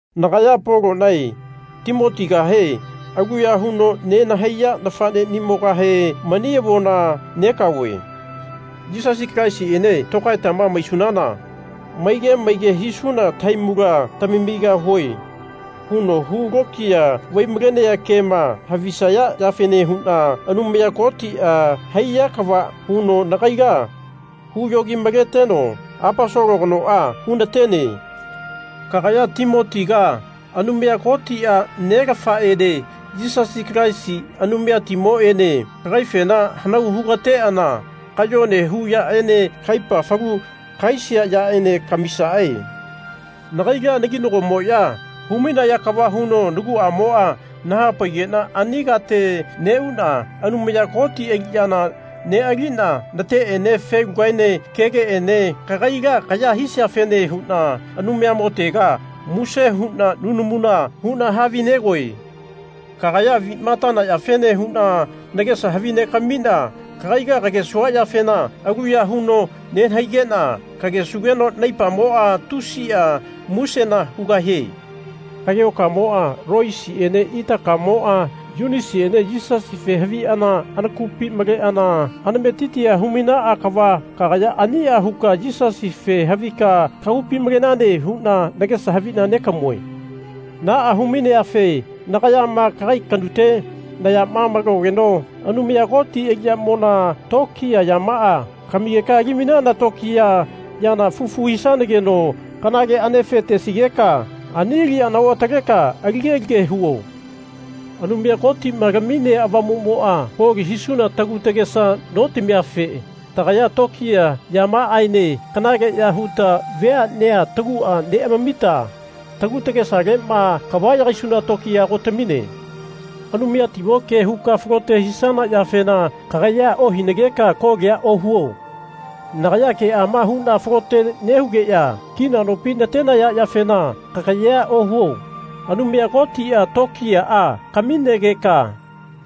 Nagaya Polonae Timotigahe aluya huno nenahaiya nafanenimogahe mani avona negaove. Yisasi Kalaisiene tokaetama maisunana Maige maige hisuna tahaimula tamamigahue. huno hulokiya vai-malenea kema havisaya yafene huno Anumaya Kotia haiya kava huno nagaila huyogi-maleteno Aposolo kanoa hunatene. Kagaya Timotiga Anumaya Kotia Nelafaene Yisasi Kalaisi Anumayatimoene kagaifena hanau hugateana kayone hu yaene kaipa falu kahaisia yaene kamisae. Nagaila naginagomoya hu-mainaya kava huno naguamoa nahapaigena ani kate neuna Anumaya Koti aliyana nealina nateene felugaene kegeene kagaila kaya hisiafene huna Anumayamotega muse huna nunamuna huna havinegoe. Kagaya avima atana yafene huna nagesa havinegamina kagaila kagesua yafena aluya huno nenahaigena kagesugeno naipamoa tusia musena hugahie. Kagehokamoa, Loisiene itakamoa, Yunasiene Yisasife haviana anakupi maleana anametitia hu-mainaa kava kagaya ania huka Yisasife havika kagupi malenane huna nagesa havina negamue. Naa hu-maineafe nagayama kagai kanute nayama malogeno Anumaya Koti aliyamona tokiya yamaa kamigeka ali-mainana tokiya yana fufu hisanageno kanale anefe tesigeka ani aliyana oataleka alige-lige huo. Anumaya Kotima laminea Avamumoa koli hisuna tagu tagesa notamiafe tagaya tokiya yamaaene kanaleya huta veanea tagua neamamita tagu tagesalema kava yagaisuna tokiya ago tamine. Anumayatimo ke huka falote hisana yafena kagayea ohinageka kolia ohuo. Nagaya keama huna falote nehugeya kina nopi natenaya yafena kagayea ohuo. Anumaya Kotia tokiyaa kaminegeka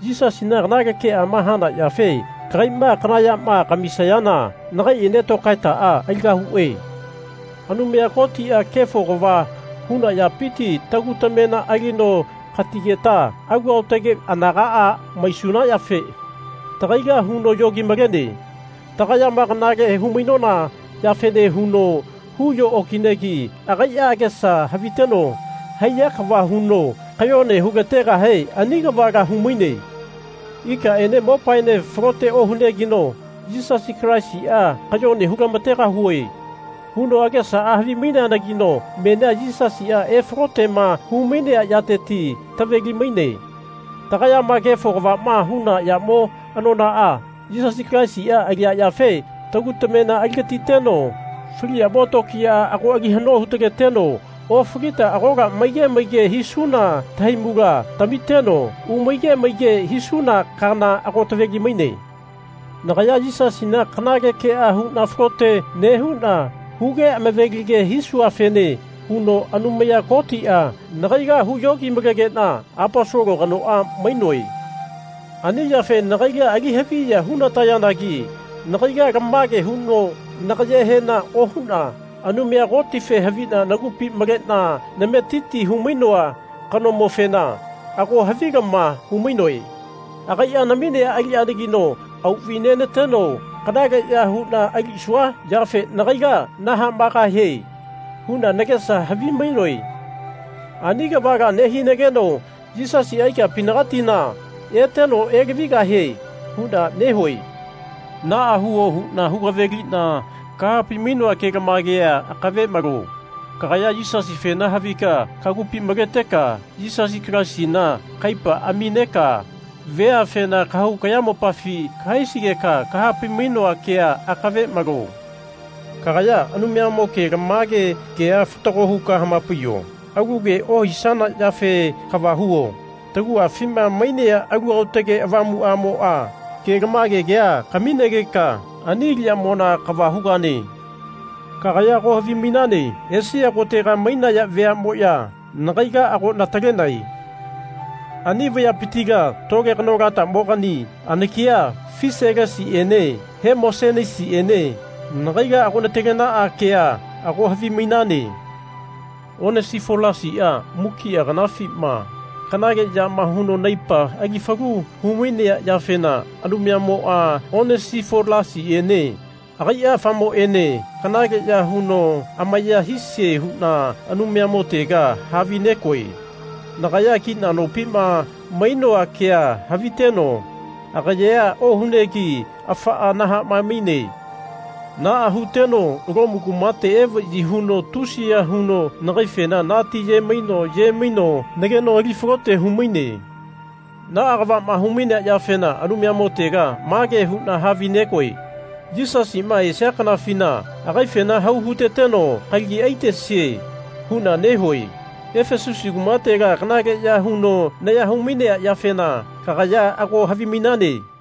Yisasina kanale keama hana yafe kagaima kana yama kamisageka nakaiene tokaetaa aligahue. Anumaya Kotia kefo kava huna yapiti tagu tamena alino katigeta alu aotage anagaa maisuna yafe tagaila huno yogi-malene. Tagayama kanale humainona yafene huno huyo okinegi agaia agesa haviteno haiya kava huno kayone hulategahe ani kavala humaine. Ikaene mopaene falote ohunegeno Yisasi Kalaisia Kayone hulamategahue. huno agesaa havimaineanagino menia Yisasia efalotema humainea yateti taveli-maine. Tagayama kefo kavama huna yamo anonaa Yisasi Kalaisia alia yafe tagu tamena aligatiteno fali yamo tokiyaa ago ali hano hu-taleteno ofalita agola maige maige hisuna tahaimula tamiteno umaige maige hisuna kaana ago taveli-maine. Nagaya Yisasina kanale kea huna falote nehuna huge amavelige hisuafene huno Anumaya Kotia nagaila huyogi-malegena Aposolo kanoa mainoe. Ani yafe nagaila ali haviya hunatayanagi nagaila lamage huno nagayehena ohuna Anumayamofe havina nagupi malena nametiti humainoa kanomofena ago havilama humainoe. Agaia naminea aliyanagino auvainenateno kanaleya huna alisua yafe Nagaila nahamaegahie. huna nagesa havimainoe. Ani kavala nehinageno Yisasia ikapinagatima eteno elavigahie huna nehue. Naa huo huna hu-kavelina kahapai-mainoa kelamagea akave malo. Kagaya Yisasifena havika kagupi maleteka Yisasi Kalaisina kaipa amineka veafena kahau kayamopafi kahaisigeka kahapai-mainoa kea akave malo. Kagaya Anumayamo kelamage kea fatago huka hamapaiyo. Alu ke ohisana yafe kava huo. Taguafima mainea Alu Aotage Avamuamoa kelamage kea kaminageka ani aliyamona kava hugane. Kagaya ago havimainane Esia kotega mainaya veamoya nagaila ago natalenae. Ani vayapitila tole kanolatamogani anakia Fiselasiene Hemosenisiene nagaila ago natalenaa kea ago havimainane. Onesifolasia mukia kanafima kanale yama huno naipa ali falu humainea yafena Anumayamoa Onesifolasiene agaia afamoene kanaleya huno amaya hisie huna Anumayamotega havinegoe. Nagaya kina nopima mainoa kea haviteno agayea ohunegi afaa nahamae-maine. Naa huteno Lomu kumate evayi huno tusiya huno nagaifena natiyemaino yemaino nageno ali falote humaine. Naa kavama humainea yafena Anumayamotega mage huna havinegoe Yisasima esia kanafina agaifena hau huteteno kalagi aitesie. huna nehue. Efesusi kumatela kanaleya huno naya humainea yafena kagaya ago havimainane.